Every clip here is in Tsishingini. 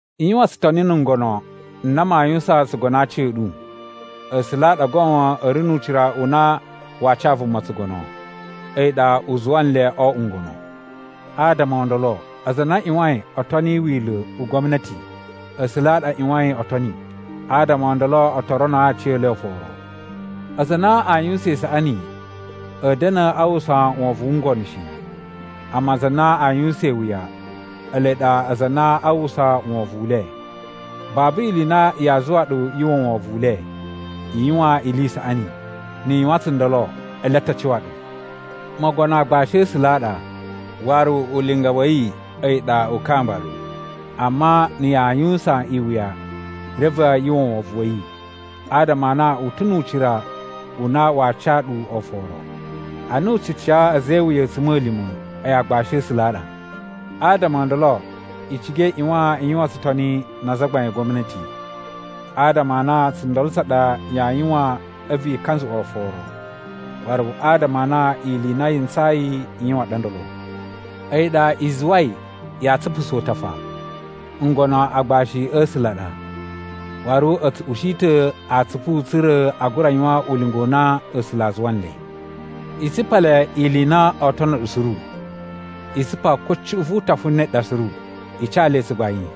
I yuwan tsutoni na̱ ngono n na maa yuwusan tsugono a aci a̱ ɗu. A̱sula̱ a ɗa goon a̱ ri nu ucira u na waa ca vuma tsugono, a̱yi ɗa u zuwa nle o oꞌwo ngono. Adama o ndolo aza a na a ꞌyuwain o toni wila̱ u gwamnati, A̱sula̱ a ɗa a ꞌyuwain o toni. Adama o ndolo o to ronoo aciyele oforo. Aza a na aa yuwusan isaꞌani, a̱a̱ da̱na̱ a uwwusa wovon wu ngono shi, amma aza a na aa yuwusan iwuya, ele ɗa aza a na aa uwwusa wovon u le. Babu ili i na yaa zuwa ɗu yu uwwa wovon u le. I yuwan ili i saꞌani, ni i yuwan tsundolo ele a ta cuwa ɗu. Mogono aagbashi a̱ A̱sula̱ a ɗa, waru ulinga wa̱ yi a̱yi ɗa u kamba ɗu. Amma na̱ yaa yuwusan iwuya, reve yu uwwa wovon wa̱ yi, adama a na u ta̱ nu ucira u na waa ca ɗu oforo. Ana u tsu ca a̱za̱ e iwuya a̱tsuma̱lima̱, a̱yi aagbashi a̱ A̱sula̱ a ɗa. Adama o ndolo i ciga i ꞌyuwan i yuwan tsutoni na azagbain a gwamnati, adama a na tsundolo tsa ɗa yaa yuwan a̱vu i kanzuꞌwa oforo, waru adama a na ili i na yi ntsayi i yuwan ɗa ndolo. A̱yi ɗa i zuwai yaa tsupusa utafa. Ngono agbashi a̱ A̱sula̱ a ɗa, waru a̱ tsu ushi ta̱ atsupu tsa̱ra̱ a gura yuwan ulinga u na A̱sula̱ a zuwa nle. I tsupa le ili i na oo tono ɗu suru. I tsupa ko cuꞌun vu utafa ne ɗa suru. I ca le tsugbain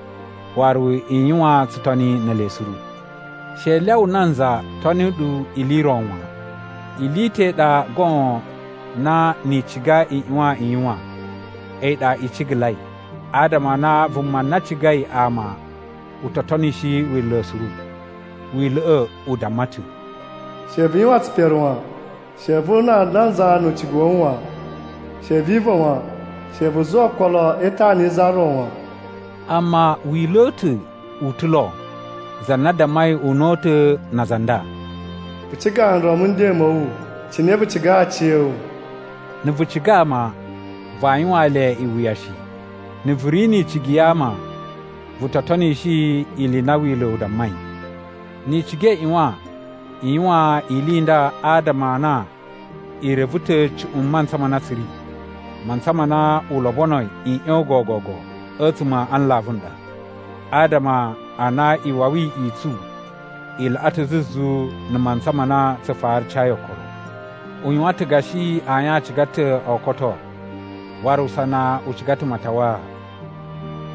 waru i yuwan tsutoni ne ele suru. She i lyawa nanza toni ɗu ili i ro wan. Ili i ta̱ i ɗa goon na ni i ciga i ꞌyuwan i yuwan, a̱yi ɗa i cigalai, adama a na vuma na cigai ama u to tonishi Wila̱ suru. Wila̱ꞌa̱ u damma ta̱, “She vu yuwan tsipere wan. She vu una nanza nu ucigu wa̱ wu wan. She vi iva̱ wan. She vu zuwa okolo e itana yi za ro wan.” Amma wila̱ u ta̱ u ta̱ lo za na dammai una̱ta̱ na aza a nda: “Vu ciga nron mu nden ma̱ wu cine vu cigai aciya̱wu.” Na̱ vu ciga ama, vaa yuwaan le iwuya shi. Na̱ vu ri ni icigi ya ama vu to tonishi ili i na Wila̱ u dammai. Ni i ciga i ꞌyuwan i yuwan ili i nda adama a na i reve ta̱ cuꞌun mantsa ma na tsu ri. Mantsa ma na u lobonoi i ꞌyon gogogo a̱tsuma̱ a nlavu a ɗa, adama a na iwawi i tsu i laꞌa ta̱ zuzu na̱ mantsa ma na tsu fara cayi okolo. U yuwan ta̱ gashi ayin a ciga ta̱ o koto, waru usana u ciga ta̱ matawaa.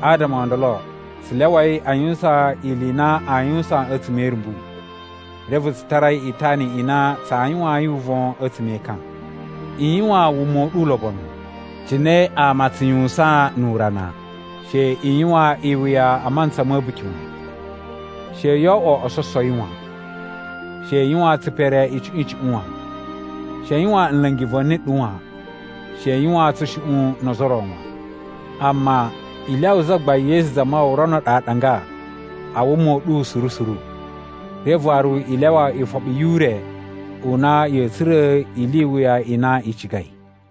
Adama o ndolo tsu lyawai a yuwusan ili i na aa yuwusan a̱tsuma̱ e irumbu, reve tsu tarai itana i na tsaa yuwayin uvon a̱tsuma̱ e ekan. I yuwan wuma u ɗu ulobonu, cine ama a tsu yuwusan nu urana. She i yuwan iwuya a mantsa ma̱ a̱buki wan. She yoo oꞌwo ososowi wan. She i yuwan tsipere icuꞌun icuꞌun wan. She i yuwan nla̱ngi va̱ni ɗu wan. She i yuwan tsushuꞌun no ozo o ro wan. Amma i lyawa Zagbain Yesu Zamawawa rono ɗu aɗanga a wuma u ɗu suru suru. Reve waru i lyawa ifoɓi yu ure u na ya̱a̱ tsura̱ ili i wuya i na i cigai.